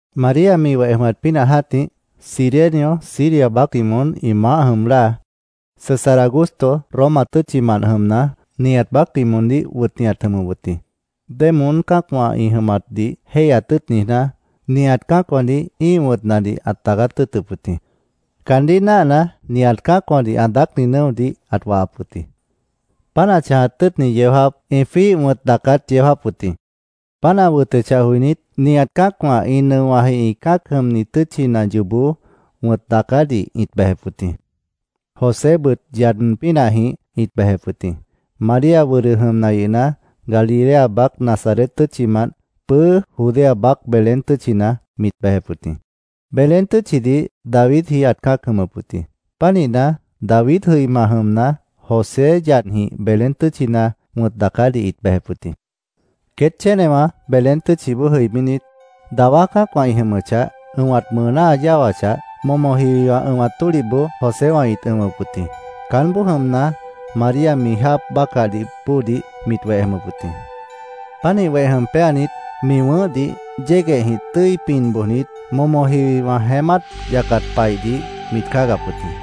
María mi weh jʉmat pínah jã́tih, Cirenio Siria baácdih moón ĩ maáh jʉm láa, César Augusto Roma tʉ́tchimant jʉmna, nihat baácdih moondíh wʉtni ãt jʉmʉp wʉt jĩ. Démoón cã́acwã ĩ jʉmatdih jéihyat tʉ́ʉt niijná, nihat cã́acwãdih ĩ́ih wʉ̃tnadih ãt daacát tʉ́ʉtʉp wʉt jĩ. Caandíh náahna, nihat cã́acwãdih ã daácni nʉ́odih ãt wahap wʉt jĩ. Páant ã chãjat tʉ́ʉtni yeó jáap ĩ jwíih wʉ̃t daacát yeó jáap wʉt jĩ. Páant ã wʉtʉchah joinít, nihat cã́acwã ĩ nʉowãji ĩ cã́ac jʉmni tʉ́tchina yoobó wʉ̃t daacádih ĩt bejep wʉt jĩ. Josébʉt yad pínahjĩh ĩt bejep wʉt jĩ. María wʉdʉ jʉmna yʉhna, Galilea baác Nazaret tʉ́tchimant, pʉ́ʉ́ Judea baác Belén tʉ́tchina mit bejep wʉt jĩ. Belén tʉ́tchidih Davidji ãt cã́ac jʉmʉp wʉt jĩ. Pánihna, David jʉima jʉmna, José yadjĩh Belén tʉ́tchina wʉ̃t daacádih ĩt bejep wʉt jĩ. Queét chénewã Belén tʉ́tchiboó jʉibínit, dawá cã́acwã ĩ jʉmʉchah, ʉ̃wat mʉʉná ã yáwachah, momo jiwiwã ʉ̃wat tólihboó Joséwã ĩt ʉ̃wʉp wʉt jĩ. Caánboó jʉmna, María mi jáap bácahdih bóodih mit weh jʉmʉp wʉt jĩ. Pánih weh jʉm péanit, mi wʉ̃ʉ́hdih yéguehjĩh tʉ́i pin bojnit, momo jiwiwã jeémát yacat paihdih mit cáagap wʉt jĩ.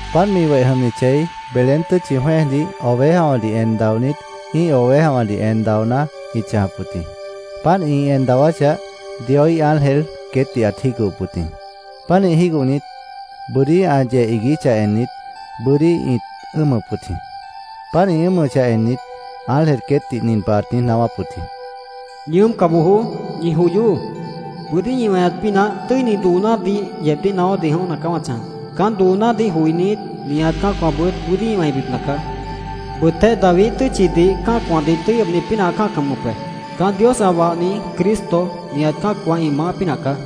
Páant mi weh jʉmni chei, Belén tʉ́tchi jwẽ́ejdih ovejawãdih en daonít ĩ́ih ovejawãdih en daoná ĩt chãjap wʉt jĩ. Páant ĩ en dawáchah, Dioíh ángel queétdih ãt jígohop wʉt jĩ. Pánih jígohnit, bʉ́dí ã yeh iiguíchah ennit, bʉ́dí ĩt ʉ́ʉmʉp wʉt jĩ. Páant ĩ ʉ́ʉmʉchah ennit, ángel queétdih nin pah ãt niíj naáwáp wʉt jĩ: “¡Ñi ʉ́ʉmca bojoó! ¡Ñi joyoó! Bʉ́dí ñi weñat pínah tʉ́ini doonádih yeebdíh naáwádih jʉ̃óhna caá wã chãjap. Caán doonádih joinít, nihat cã́acwãbʉt bʉ́dí ĩ wẽibipna caá. Bʉtéh Daviíh tʉ́tchidih cã́acwãdih tʉ́i ʉbni pínah ã cã́ac jʉmʉp be. Caán Dios ã wahni Cristo, nihat cã́acwã ĩ maáh pínah caá.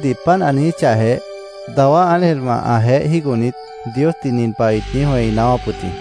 Ángel queétdih páant ã niijíchahjeh, dawá ángelwã ãjeéh jígohnit, Diosdih nin pah ĩt niíj wẽi naáwáp wʉt jĩ: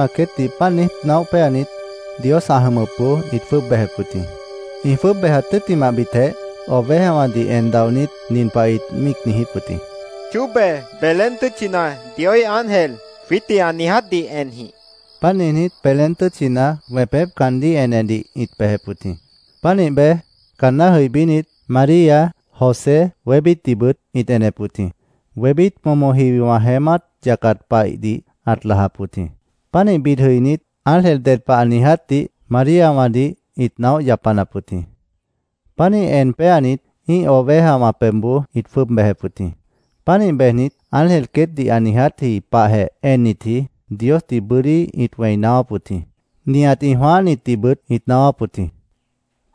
Ángelwã queétdih páant niíj naóh péanit, Dios ã jʉmʉpboó ĩt jwʉ́ʉb bejep wʉt jĩ. Ĩ jwʉ́ʉb bejat tʉ́ttimahbitjeh, ovejawãdih en daonít nin pah ĩt míic niijíp wʉt jĩ: —Chóbe, Belén tʉ́tchina Dioíh ángel jwiítdih ã niijátdih enjĩh, ĩt niijíp wʉt jĩ. Páant niijnít, Belén tʉ́tchina wẽpép caandíh enedih ĩt bejep wʉt jĩ. Pánih bej, caanná jʉibínit, María, José, wébítdihbʉt ĩt enep wʉt jĩ. Wébít momo jiwiwã jeémát yacat paihdih ãt lajap wʉt jĩ. Pánih bid jʉinít, ángel ded pah ã niijátdih Maríawãdih ĩt naóh yapanap wʉt jĩ. Pánih en péanit, ĩ́ih ovejawã pebhboó ĩt jwʉ́ʉb bejep wʉt jĩ. Pánih bejnit, ángel queétdih ã niijátji pahjeh ennitji Diosdih bʉ́dí ĩt wẽi naáwáp wʉt jĩ. Nihat ĩ jwãáhnitdihbʉt ĩt naáwáp wʉt jĩ.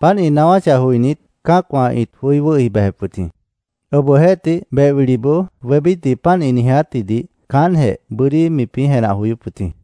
Páant ĩ naáwáchah joinít, cã́acwã ĩt joí wʉ́hi bejep wʉt jĩ. Obohjeéhtih, beh wiliboó wébítdih páant ĩ niijátjidih caántjeh bʉ́dí mipĩ́ jenah joyóp wʉt jĩ.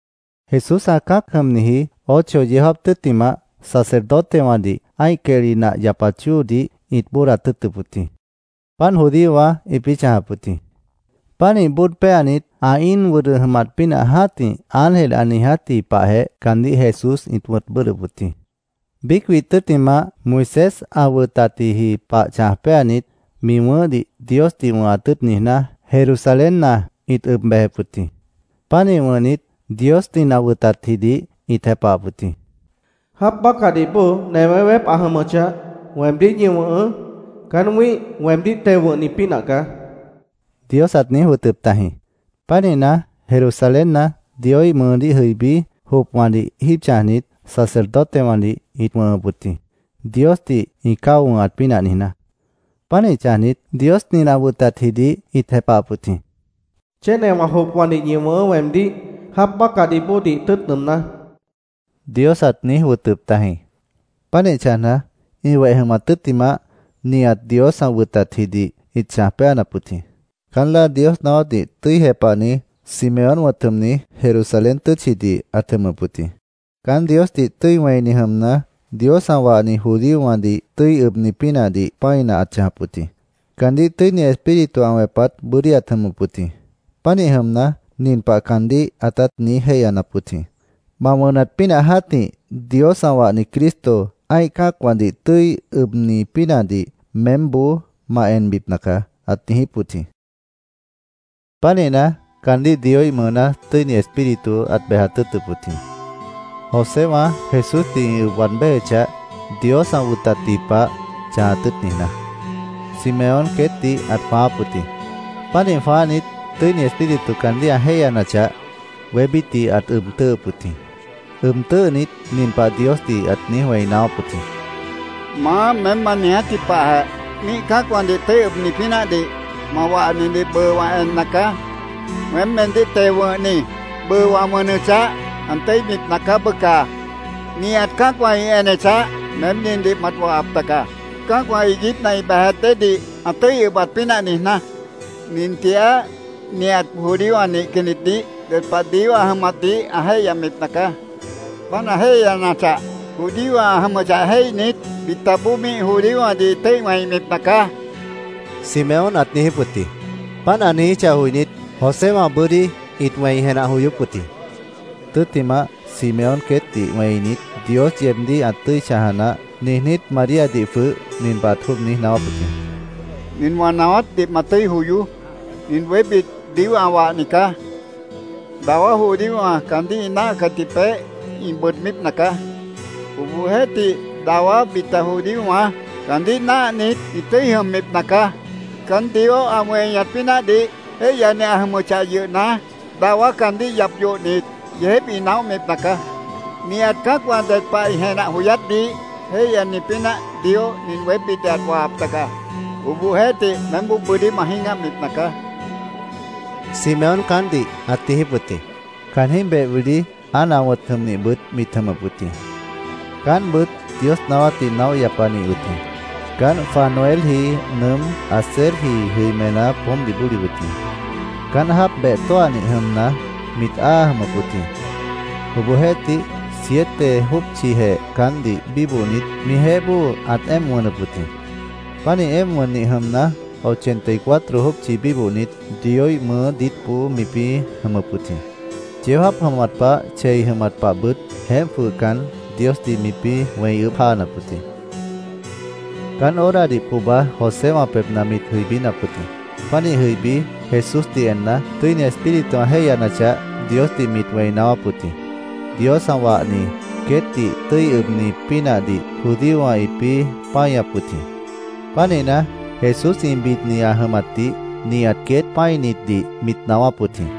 Jesús ã cã́ac jʉmniji ocho yeó jáap tʉ́ttimah, sacerdotewãdih ã́ih quehli nah yapat chóodih ĩt bóodat tʉ́ʉtʉp wʉt jĩ. Páant judíowã ĩpĩ́ chãjap wʉt jĩ. Pánih bóod péanit, ã íin wʉdʉ jʉmat pínah jã́tih ángel ã niijátji pahjeh caandíh Jesús ĩt wʉ̃t bʉ́ʉdhdʉp wʉt jĩ. Biíc widh tʉ́ttimah, Moisés ã wʉtatji pah chãj péanit, mi wʉ̃ʉ́hdih Diosdih wʉ̃hat tʉ́ʉt niijná, Jerusalénna ĩt ʉb bejep wʉt jĩ. Pánih wʉ̃hnit, Dios nin ã wʉtatjidih ĩt jepahap wʉt jĩ: “Jáap bácahdih bóo newé weép ã jʉmʉchah, weemdíh ñi wʉ̃hʉʉ́. Caán wĩ́ih, weemdíh teo wʉ̃hni pínah caá”, Dios ãt niíj wʉtʉp tajĩ. Pánihna, Jerusalénna Dioíh mʉʉdíh jʉibí, jopwãdih jíib chãjnit, sacerdotewãdih ĩt wʉ̃hʉp wʉt jĩ, Diosdih ĩ cáo wʉ̃hat pínah niijná. Pánih chãjnit, Dios nin ã wʉtatjidih ĩt jepahap wʉt jĩ: “Chénewã jopwãdih ñi wʉ̃hʉʉ́ weemdíh, jáap bácahdih bóodih tʉ́ʉt nʉʉmná”, Dios ãt niíj wʉtʉp tajĩ. Pánih chãjna, ĩ weh jʉmat tʉ́ttimah, nihat Dios ã wʉtatjidih ĩt chãj péanap wʉt jĩ. Caán láa Dios naáwátdih tʉ́i jepahni, Simeón wʉ̃t jʉmni, Jerusalén tʉ́tchidih ãt jʉmʉp wʉt jĩ. Caán Diosdih tʉ́i wẽini jʉmna, Dios ã wahni judíowãdih tʉ́i ʉbni pínahdih pã́ina ãt chãjap wʉt jĩ. Caandíh Tʉ́ini Espíritu ã wẽpat bʉ́dí ãt jʉmʉp wʉt jĩ. Pánih jʉmna, nin pah caandíh ãtát niíj jéihyanap wʉt jĩ: “Ma wʉnat pínah jã́tih Dios ã wahni Cristo, ã́ih cã́acwãdih tʉ́i ʉbni pínahdih meémboó ma enbipna caá”, ãt niijíp wʉt jĩ. Pánihna, caandíh Dioíh mʉʉná Tʉ́ini Espíritu ãt bejat tʉ́ʉtʉp wʉt jĩ. Joséwã Jesúsdih ĩ ʉb waad béjechah, Dios ã wʉtatji pah chãjat tʉ́ʉt niijná, Simeón queétdih ãt jwãááp wʉt jĩ. Pánih jwãáhnit, Tʉ́ini Espíritu caandíh ã jéihyanachah, wébítdih ãt ʉb tʉ́ʉhʉp wʉt jĩ. Ʉb tʉ́ʉhnit, nin pah Diosdih ãt niíj wẽi naáwáp wʉt jĩ: “Maá, meém ma niijátji pahjeh míih cã́acwãdih tʉ́i ʉbni pínahdih ma wahnidih bʉʉ wã enna caá. Weém, meemdíh teo wʉ̃hni, bʉʉ wã wʉnʉchah, ã tʉ́ibipna caá, bʉca. Nihat cã́acwã ĩ enechah, meém nindih mat wahap taga, cã́acwã iiguípna ĩ bejat déedih ã tʉ́i ʉbat pínah niijná. Nin tigaá nihat judíowã nihcannitdih ded pah Dios ã jʉmatdih ã jéihyabipna caá. Páant ã jéihyanachah, judío ã jʉmʉchah jéihnit, bitaboó míih judíowãdih ĩ tʉ́i wẽibipna caá”, Simeón ãt niijíp wʉt jĩ. Páant ã niijíchah joinít, Joséwã bʉ́dí ĩt wẽi jenah joyóp wʉt jĩ. Tʉ́ttimah, Simeón queétdih wẽinit, “Dios yeebdíh ã tʉ́i chãja naáh”, niijnít, Maríadih jwʉh nin pah ãt jwʉ́ʉb niíj naáwáp wʉt jĩ: —Nin wã naáwátdih ma tʉ́i joyoó. Nin wébít Dios ã wahni caá. Dawá judíowã caandíh ĩ náahcatji peéh ĩ bʉʉdbípna caá. Obohjeéhtih, dawá bita judíowã caandíh náahnit, ĩ tʉ́i jʉmbipna caá. Caán Dios ã weñat pínahdih jéihyani ã jʉmʉchah yʉhna, dawá caandíh yap yohnit, yeejép ĩ naóhbipna caá. Nihat cã́acwã ded pah ĩ jenah joyátdih jéihyani pínah Dios nin wébítdih ãt wahap taga. Obohjeéhtih, meémboó bʉ́dí ma jĩ́gahbipna caá, Simeón caántdih ãt niijíp wʉt jĩ. Caanjĩ́h beh wili Ana wʉ̃t jʉmnihbʉt mit jʉmʉp wʉt jĩ. Caántbʉt Dios naáwátdih naóh yapanih wʉt jĩ. Caánt Fanuelji nʉʉ́m, Aserji jʉimená poómpdih bóli wʉt jĩ. Caánt jáap beh tóahnih jʉmna, mit áa jʉmʉp wʉt jĩ. Obohjeéhtih, siete jópchijeh caántdih bíbohnit, mijeéh bóo ãt éemp wʉnʉp wʉt jĩ. Pánih éemp wʉnnih jʉmna, ochenta y cuatro jópchi bíbohnit, Dioíh mʉʉ́ diítboó mipĩ́ jʉmʉp wʉt jĩ. Yeó jáap jʉmat pah, chei jʉmat pahbʉt jeémp jwʉhcan, Diosdih mipĩ́ wẽi ʉʉ́bh jáanap wʉt jĩ. Caán horadih pohba Joséwã pebhna mit jʉibínap wʉt jĩ. Pánih jʉibí, Jesúsdih enna, Tʉ́ini Espíritu ã jéihyanachah, Diosdih mit wẽi naáwáp wʉt jĩ. Dios ã wahni, queétdih tʉ́i ʉbni pínahdih judíowã ĩpĩ́ páñap wʉt jĩ. Pánihna, Jesús ĩ bidni ã jʉmatdih nihat queét pã́initdih mit naáwáp wʉt jĩ.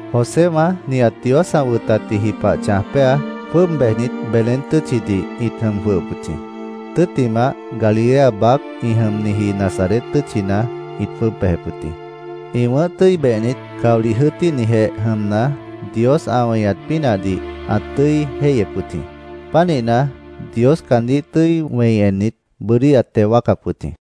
Joséwã nihat Dios ã wʉtatji pah chãj péa, jwʉ́ʉb bejnit, Belén tʉ́tchidih ĩt jʉm jwʉhʉp wʉt jĩ. Tʉ́ttimah, Galilea baác ĩ jʉmniji Nazaret tʉ́tchina ĩt jwʉ́ʉb bejep wʉt jĩ. Ĩ wʉ̃ʉ́h tʉ́i behnit, caolih jʉ́ʉtíhnijeh jʉmna, Dios ã weñat pínahdih ãt tʉ́i jéihyep wʉt jĩ. Pánihna, Dios caandíh tʉ́i wẽi ennit, bʉ́dí ãt teo wáacap wʉt jĩ.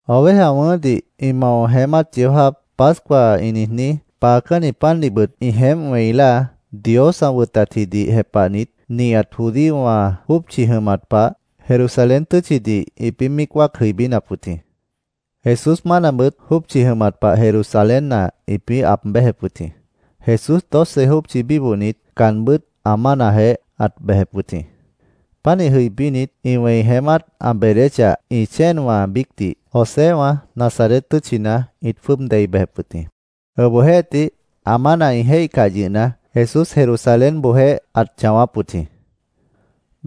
Oveja wʉ̃ʉ́hdih ĩ mao jeémát yeó jáap, Pascua ĩ niijní, paacánni pandihbʉt ĩ jeémp wẽi láa, Dios ã wʉtatjidih jepahnit, nihat judíowã jópchi jʉmat pah, Jerusalén tʉ́tchidih ĩpĩ́ míic wáac jʉibínap wʉt jĩ. Jesús mánabʉt jópchi jʉmat pah Jerusalénna ĩpĩ́ aab béjep wʉt jĩ. Jesús doce jópchi bíbohnit, caanbʉ́t ã mánajeéh ãt bejep wʉt jĩ. Pánih jʉibínit, ĩ wẽi jeémát ã beedéchah, ĩ chéenwã biícdih Joséwã Nazaret tʉ́tchina ĩt jwʉ́ʉb dei bejep wʉt jĩ. Obohjeéhtih, ã mána ĩ jéihcah yʉhna, Jesús Jerusalénboojéh ãt chãwáp wʉt jĩ.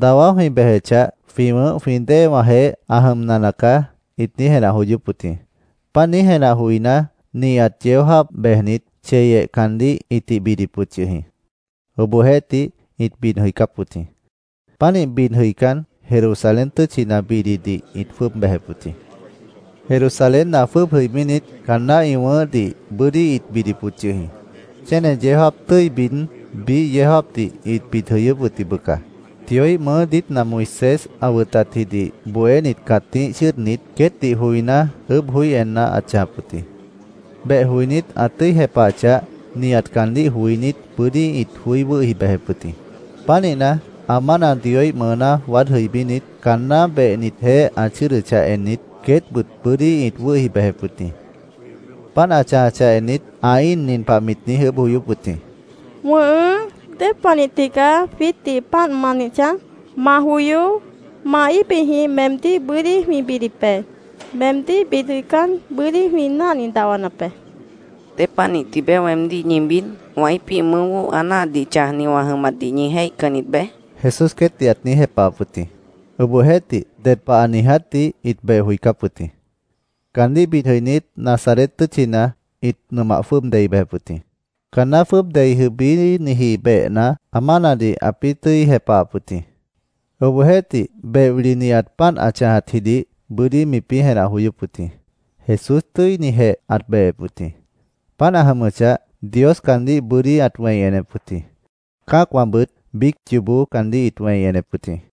“Dawá jwĩ bejechah, jwĩ wʉ̃ʉ́h jwĩ déewãjeéh ã jʉmna nacaá”, ĩt niíj jenah joyóp wʉt jĩ. Páant niíj jenah joiná, nihat yeó jáap bejnit, cheyeh caandíh ĩtih bidip wʉt yʉh jĩ. Obohjeéhtih, ĩt bid jʉicáp wʉt jĩ. Pánih bid jʉicán, Jerusalén tʉ́tchina bididih ĩt jwʉ́ʉb bejep wʉt jĩ. Jerusalénna jwʉ́ʉb jʉibínit, caanná ĩ wʉ̃ʉ́hdih bʉ́dí ĩt bidip wʉt yʉh jĩ. Chéne yeó jáap tʉ́i bid, biíh yeó jáapdih ĩt bid jʉyʉ́p wʉt jĩ, bʉca. Dioíh mʉʉ́ diítna Moisés ã wʉtatjidih bohénit cãtíh chʉ́ʉdnit, queétdih joiná, ʉʉ́bh joí enna ãt chãjap wʉt jĩ. Beh joinít, ã tʉ́i jepahachah, nihat caandíh joinít bʉ́dí ĩt joí wʉ́hi bejep wʉt jĩ. Pánihna, ã mána Dioíh mʉʉná waád jʉibínit, caanná behnitjeéh ã chʉ́ʉdʉchah ennit, queétbʉt bʉ́dí ĩt wʉ́hi bejep wʉt jĩ. Páant ã chãjachah ennit, ã íin nin pah mit niíj ʉʉ́bh joyóp wʉt jĩ: —¿Wʉ̃ʉhʉ́, dépanih tigaá jwiítdih páant ma nih chãj? Ma joyoó, ma íbijĩh meemdíh bʉ́dí jwĩ bidip be. Meemdíh bid jʉicán, bʉ́dí jwĩ náhni dahwanap be, mit niijíp wʉt jĩ. —¿Dépanih tibeé weemdíh ñi bid? ¿Wã íipíh mʉʉ́boó ã náahatdih chãjni wã jʉmatdih ñi jéihcannit beé? Jesús queétdih ãt niíj jepahap wʉt jĩ. Obohjeéhtih, ded pah ã niijátdih ĩt beh joicáp wʉt jĩ. Caandíh bid jʉinít, Nazaret tʉ́tchina ĩt nʉmah jwʉ́ʉb dei bejep wʉt jĩ. Caanná jwʉ́ʉb dei jʉibíniji behna, ã mánadih ãpĩ́ tʉ́i jepahap wʉt jĩ. Obohjeéhtih, beh wili nihat páant ã chãjatjidih bʉ́dí mipĩ́ jenah joyóp wʉt jĩ. Jesús tʉ́i jéihnijeh ãt behep wʉt jĩ. Páant ã jʉmʉchah, Dios caandíh bʉ́dí ãt wẽi enep wʉt jĩ. Cã́acwãbʉt biíc yoobó caandíh ĩt weñep wʉt jĩ.